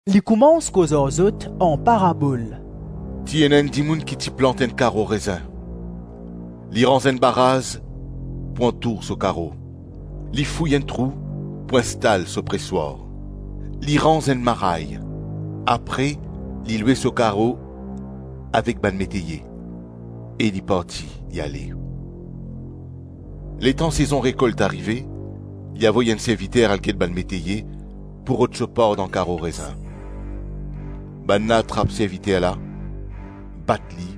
Li koumans koz ar zot an parabol. “Ti ena enn dimoun ki ti plant enn karo rezin; li ranz enn baraz pou antour so karo, li fouy enn trou pou instal so preswar, li ranz enn maray; apre li lwe so karo avek bann meteye e li parti, li ale. Letan sezon rekolt arive, li avoy enn serviter al get bann meteye pou rod so par dan karo rezin. Bannla trap serviter la, bat li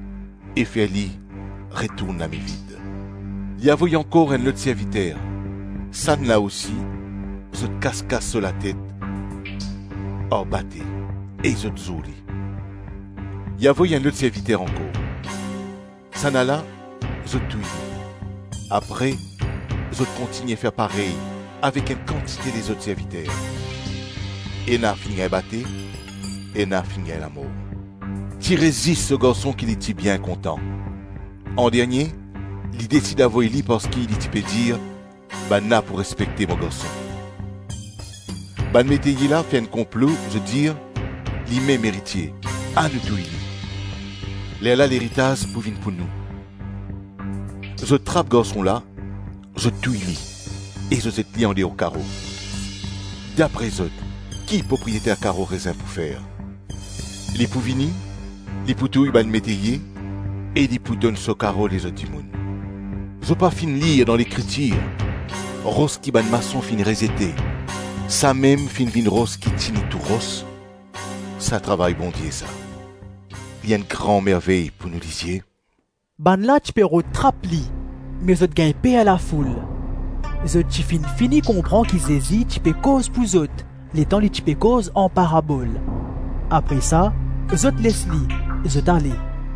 e fer li retourn lame vid. Li avoy ankor enn lot serviter; sannla osi, zot kas-kas so latet ar bate e zot zour li. Li avoy enn lot serviter ankor; sannala, zot touy li. Apre zot kontign fer parey avek enn kantite lezot serviter. Ena finn gagn bate, ena finn gagn lamor. Ti res zis so garson ki li ti bien kontan; andernie li desid avoy li parski li ti pe dir, ‘Bannla pou respekte mo garson.’ Bann meteye la fer enn konplo, zot dir, ‘Limem eritie, anou touy li, lerla leritaz pou vinn pou nou.’ Zot trap garson la, zot touy li e zot zet li andeor karo. Dapre zot, ki propriyeter karo rezin pou fer? Li pou vini, li pou touy bann meteye e li pou donn so karo lezot dimoun. Zot pa finn lir dan Lekritir, ‘Ros ki bann mason finn rezete, samem finn vinn ros ki tini tou ros. Sa travay Bondie, sa, li enn gran mervey pou nou lizie.’?” Bannla ti pe rod trap li me zot gagn per lafoul. Zot ti finn fini konpran ki Zezi ti pe koz pou zot, letan li ti pe koz an parabol. Apre sa, zot les li, zot ale.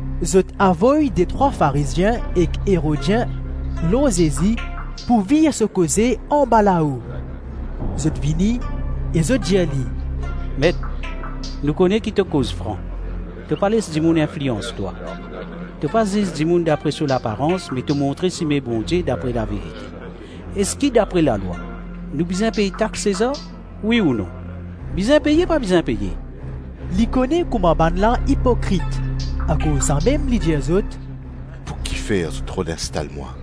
Zot avoy detrwa Farizien ek Erodien lor Zezi pou vir so koze anbalao. Zot vini e zot dir li, “Met, nou kone ki to koz fran, to pa les dimoun inflians twa, to pa ziz dimoun dapre so laparans me to montre sime Bondie dapre laverite; eski dapre lalwa nou bizin pey tax Sezar, wi ou non? Bizin peye, pa bizin peye?” Li kone kouma bannla ipokrit; akoz samem li dir zot, “Pou ki fer zot rod instal mwa?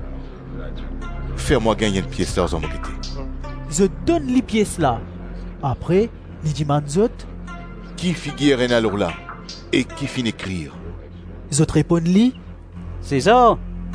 Fer mwa gagn enn pies larzan mo gete.” Zot donn li pies la; apre li dimann zot, “Ki figir ena lor la e ki finn ekrir?” Zot reponn li, “Sezar.”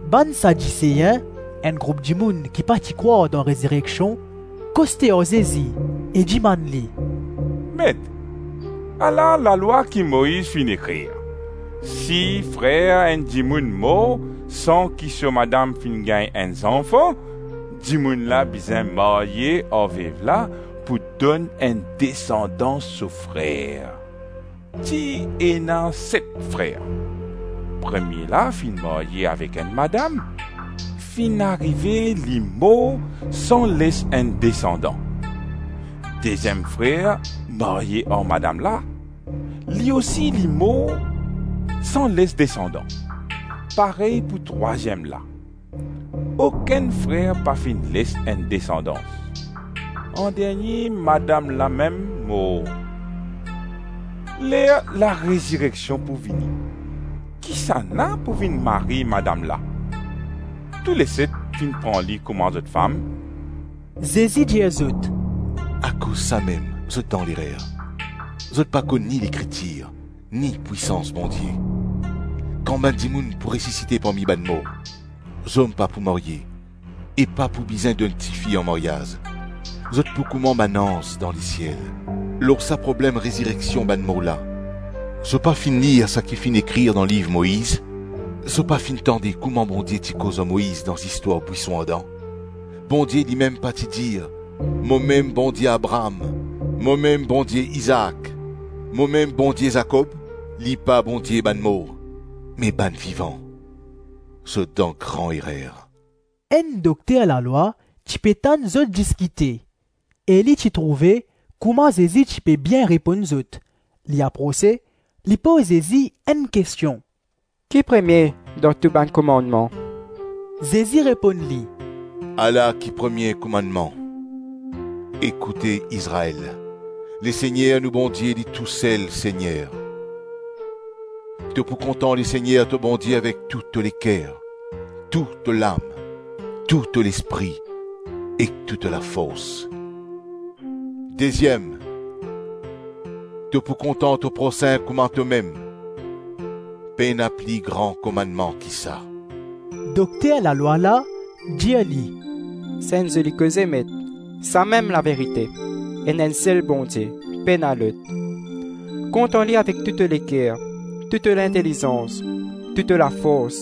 Bann Sadisein - enn group dimoun ki pa ti krwar dan rezireksion koste ar Zezi e dimann li, “Met, ala lalwa ki Moiz finn ekrir: si frer enn dimoun mor san ki so madam finn gagn enn zanfan, dimoun la bizin marye ar vev la pou donn enn desandans so frer. Ti ena set frer. Premie la finn marye avek enn madam; finn arive li mor san les enn desandan. Deziem frer marye ar madam la; li ousi li mor san les desandan; parey pou trwaziem la. Okenn frer pa finn les enn desandans. Andernie, madam la mem mor. Ler larezireksion pou vini, kisannla pou vinn mari madam la? Touleset finn pran li kouma zot fam.” Zezi dir zot, “Akoz samem zot dan lerer, zot pa konn ni Lekritir, ni pwisans Bondie. Kan bann dimoun pou resisite parmi bann mor, zom pa pou marye e pa pou bizin donn tifi an maryaz, zot pou kouma bann anz dan lesiel. Lor sa problem rezireksion bann mor la, zot pa finn lir saki finn ekrir dan liv Moiz? Zot pa finn tande kouma Bondie ti koz ar Moiz dan zistwar bwison ardan? Bondie limem pa ti dir, ‘Momem Bondie Abraam, momem Bondie Izaak, momem Bondie Zakob’? Li pa Bondie bann mor me bann vivan, zot dan gran erer.” Enn dokter lalwa ti pe tann zot diskite e li ti trouve kouma Zezi ti pe bien reponn zot; li aprose, li poz Zezi enn kestion, “Ki premie dan tou bann komannman?” Zezi reponn li, “Ala ki premie komannman: Ekoute, Izrael! Lesegner nou Bondie li tousel Segner, To pou kontan Lesegner to Bondie avek tou to leker, tou to lam, tou to lespri ek tou to lafors. Deziem, to pou kontan to prosin kouma tomem. Pena pli gran komannman ki sa.” Dokter lalwa la dir li, “Sa enn zoli koze Met, samem laverite, ena enn sel Bondie, pena lot. Kontan li avek tou to leker, tou to lintelizans, tou to lafors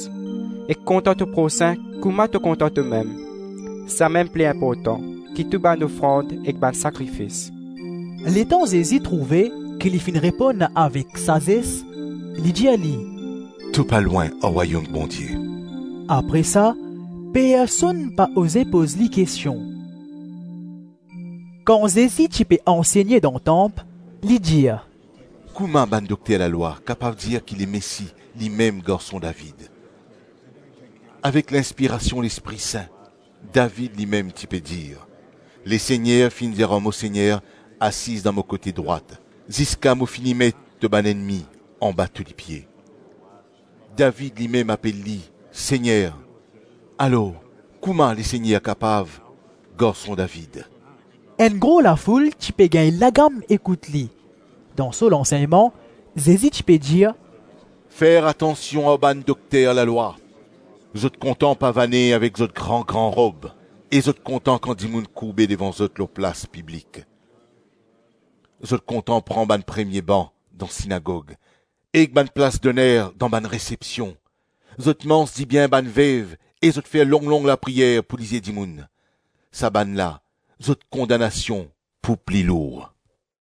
ek kontan to prosin kouma to kontan tomem, samem pli inportan ki tou bann ofrand ek bann sakrifis.” Letan Zezi trouve ki li finn reponn avek sazes, li dir li, “To pa lwin ar Rwayom Bondie.” Apre sa, personn pa oze poz li kestion. Eski Lemesi garson David? Kan Zezi ti pe ansegne dan tanp, li dir, “Kouma bann dokter lalwa kapav dir ki Lemesi, limem garson David? Avek linspirasion Lespri Sin, David limem ti pe dir, ‘Lesegner finn dir ar mo Segner, asiz dan mo kote drwat, ziska mo fini met to bann ennmi anba to lipie.’ David limem apel li, Segner; alors kouma Lesegner kapav garson David?” Enn gro lafoul ti pe gagn lagam ekout li. Dan so lansegnman Zezi ti pe dir, “Fer atansion ar bann dokter lalwa. Zot kontan pavane avek zot gran-gran rob e zot kontan kan dimoun kourbe devan zot lor plas piblik. Zot kontan pran bann premie ban dan sinagog ek bann plas-doner dan bann resepsion, Zot manz dibien bann vev e zot fer long-long lapriyer pou lizie dimoun, sa bannla, zot kondanasion pou pli lour.”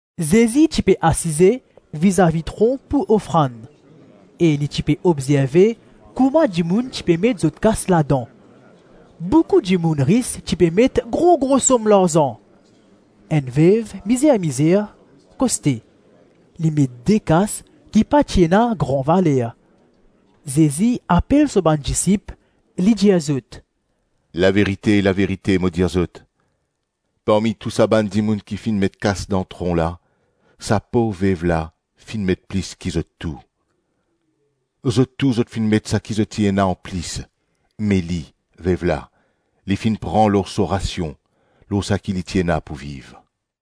Zezi ti pe asize vizavi tron pou ofrand, e li ti pe obzerve kouma dimoun ti pe met zot kas ladan; boukou dimoun ris ti pe met gro-gro som larzan. Enn vev mizer-mizer koste, li met de kas ki pa ti ena gran valer. Zezi apel so bann disip, li dir zot, “Laverite, laverite mo dir zot, parmi tou sa bann dimoun ki finn met kas dan tron la, sa pov vev la, finn met plis ki zot tou. Zot tou zot finn met saki zot ti ena anplis, me li, vev la, li finn pran lor so rasion, lor saki li ti ena pou viv.”